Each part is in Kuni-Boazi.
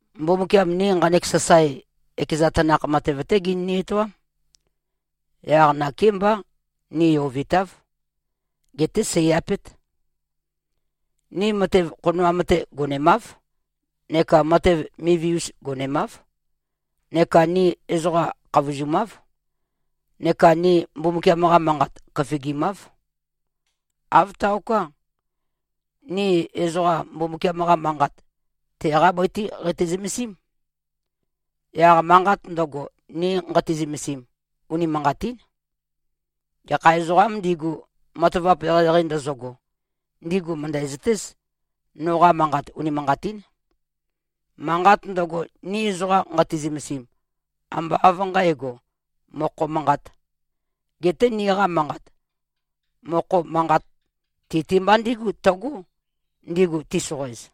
Mbumbukiam ni nqanek sasae, ekeza tanakh matev-té genøni-etoám. Yaq nakémbá ni yovitáv. Geté sèi-apét. Ni matev khonoam-te gonemáv neka matev mivi-us gonemáv, neka ni ezoqa khavozumáv, neka ni Mbumbukiam-qa Manqat køfigimáv. Āv taoká. Ni ezoqa Mbumbukiam-qa Manqat, teqá bøi-té qeitø-zømesím. Yaq manqat ndøgo, ni nqati-zømesim, unimanqatín. Gekha ezoqām ndigu, matavap eqeieqei ndøzøgo, ndigu mø̀ndæzøtéz, noqa manqat unimanqatín. Manqat ndøgo, ni ezoqa nqati-zømesim, ambá av nqǣgo, mokho manqāt. Geté niqa manqat, mokho manqat ti-te mba ndígu tøgó, ndigu tisoqoez.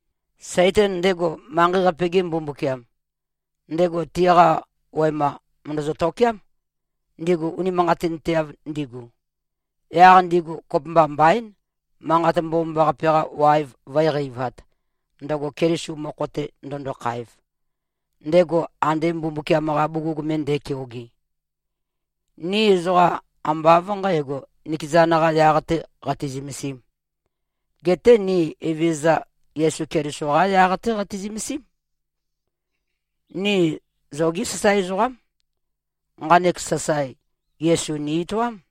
Saitan, ndego manqei-qape-ge mbumbukiam, ndego tiqa wema mø̀ndøzø-tokéam, ndigu unimanqatinteav ndigu. Yaq ndigu kopømba mbaín, Manqat Mbomambaqape-qa waev vǿe-qeivāt, ndøgo Keliso mokho-te ndøndokhaev, ndego ande Mbumbukiam-qa bugug me nde꞉keoge. Ni ezoqa ambá av nqǣgo, nikezan-qā yaq-tē qati-zømesīm. Geté ni Evezøza Yesu Keliso-qá yaq-té qati-zømesím. Ni zogí sasae ezoqám. Nqanek sasae, Yesu ni-etoám.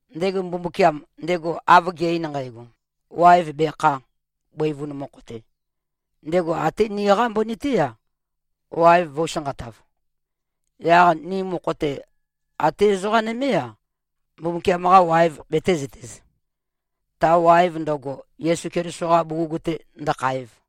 Ndego Mbumbukiam, ndego av ge꞉-ein nqægo, “Waev bekhā, bøivun mokho-te,” ndego até niqá mbøni-té-a, waev vø̄u-sanqatav. Yaq ni mokho-te, até ezoqa nømé-a, Mbumbukiam-qa waev betēzøtez, ta waev ndøgo, Yesu Keliso-qa bugug-te ndøkhaev.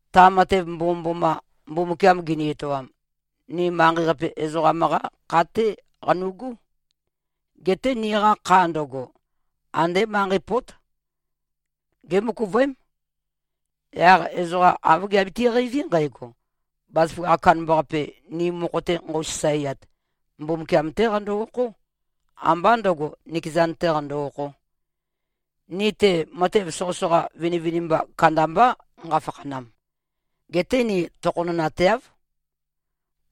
Ta matev mbomømboma, Mbumbukiam gini-etoam, ni manqei-qape ezoqam-qá kha-té qanu꞉gú. Geté niqa kha ndøgo, andé manqei pót. Gémøkuvøém. Yaq ezoqa āv giabiti-qeiví nqægo, bazaføgakh kandambaqape, ni mokho-te nqøu-sasaeat, Mbumbukiam-té qando-okhó, ambá ndø̄go, nikezan-tē qando-okhō. Ni-te, matev soqøsoqa vinivinimba kandambá nqafakhanam. Geté ni tokhonønateáv.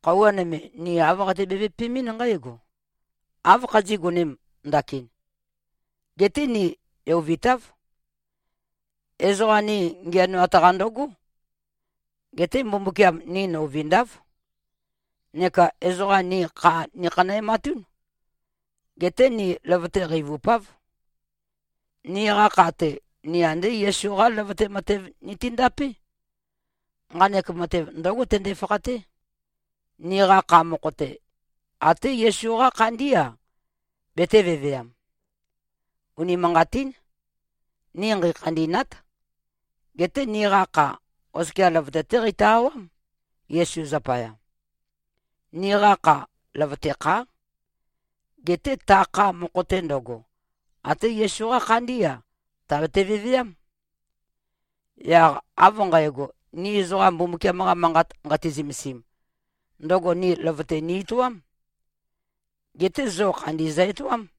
Khøuwa nøme, ni āv qati-bevøpemɨ́n nqǽgo, “Áv khazí꞉-gonēm ndakin,” geté ni yovitáv. Ezoqa ni ngiænoat-qa ndøgó. Geté Mbumbukiam ni nøuvindáv. Neka ezoqa ni kha nikhanæmatún. Geté ni løvøte qeivupáv. Niqa kha-te, ni andé Yesu-qá løvøte matev nitindapé. Nqanek matev ndǿgo tønde-fakhaté: Niqa kha mokho-te, até Yesu-qá khandí-a, betē-veveam. Unimanqatín. Ni nqeikhandî꞉nát. Geté niqa kha, oskia løvøte-té qeitø-awám, Yesu zapaya. Niqa kha, løvøte khá. Geté ta kha mokho-te ndøgo, até Yesu-qá khandí-a, tàbete-veveám. Yaq av nqægo, ni ezoqa Mbumbukiam-qa Manqat nqati-zømesim, ndøgo ni løvøte ni-etoám. Geté zo khandi zø-etoám.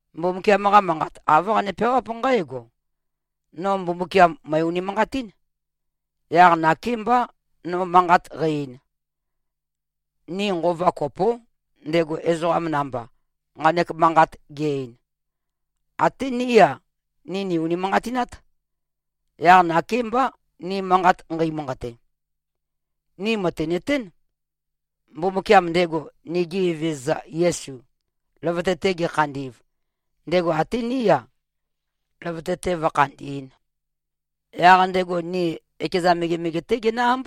Mbumbukiam-qa Manqat, āv qane-peawáp nqǽgo, “No Mbumbukiam, mø̀e-unimanqatín. Yaq nakémbá, no manqat qæ-ein.” Ni nqova kopó, ndego ezoqa namba, nqanek manqat ge-ein. Até ní-a, ni nì-unimanqatinát. Yaq nakémbá, ni manqat nqeimanqate. Ni mø̀tinøtén, Mbumbukiam, ndego nigi Evezøza Yesu, løvøte-te gekhandi꞉v, ndego até ní-a, løvøte-te vǿkhandī꞉n. Yaq ndego ni ekeza megemege-té genǿ-ámb.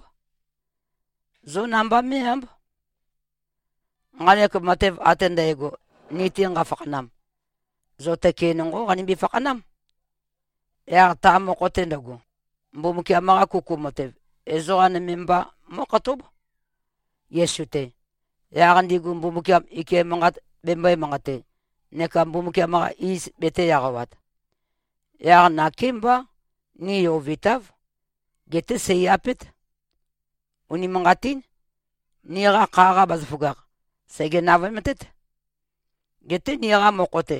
Zó namba mé꞉-ámb. Nqanek matev ate ndægo, ni-te nqafakhanam, zo tøke nonqó qanimbi-fakhanám. Yaq ta mokho-te ndøgo, Mbumbukiam-qa kuku matev, ezoqa nøme mba mó꞉khatób, Yesu-te, yaq ndigu Mbumbukiam ike manqat bembøē-manqate neka Mbumbukiam-qa iz betē-eqawat. Yaq nakémbá ni yovitáv. Geté seì-apét. Unimanqatín. Niqa kha-qa bazaføgakh, sège-navøemtét. Geté niqa mokho-te,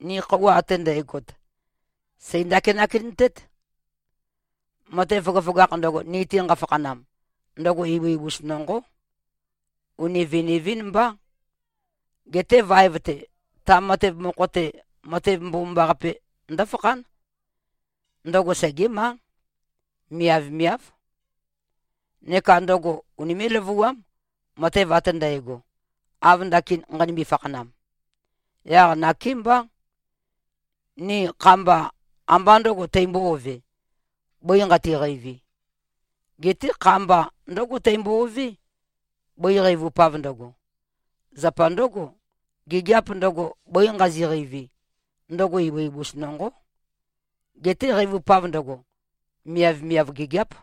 ni khøuwa ate ndægot, sèi-ndakinak-entét. Matev føgøføgakh ndøgo, ni-te nqafakhanam, ndøgo ibu-ibus nonqó. Uni viniv-ín mbá. Geté vaev-te, ta matev mokho-te, matev mbomambaqape ndǿfakhán. Ndøgo segémá. Miavmiáv. Neka ndøgo unimé꞉-løvuám, matev ate ndægo, av ndakin nqanimbi-fakhanam. Yaq nakémbá. Ni kha-mba, ambá ndø̄go teimbo-ovē, bøi nqati-qeivi. Geté kha-mba ndǿgo teimbo-ové, bøi qeivupav ndøgo. Zapa ndǿgo, gigiap ndøgo, bøi nqazi꞉-qeivi, ndøgo ibu-ibus nonqó. Geté qeivupav ndøgo, miavmiav gigiáp.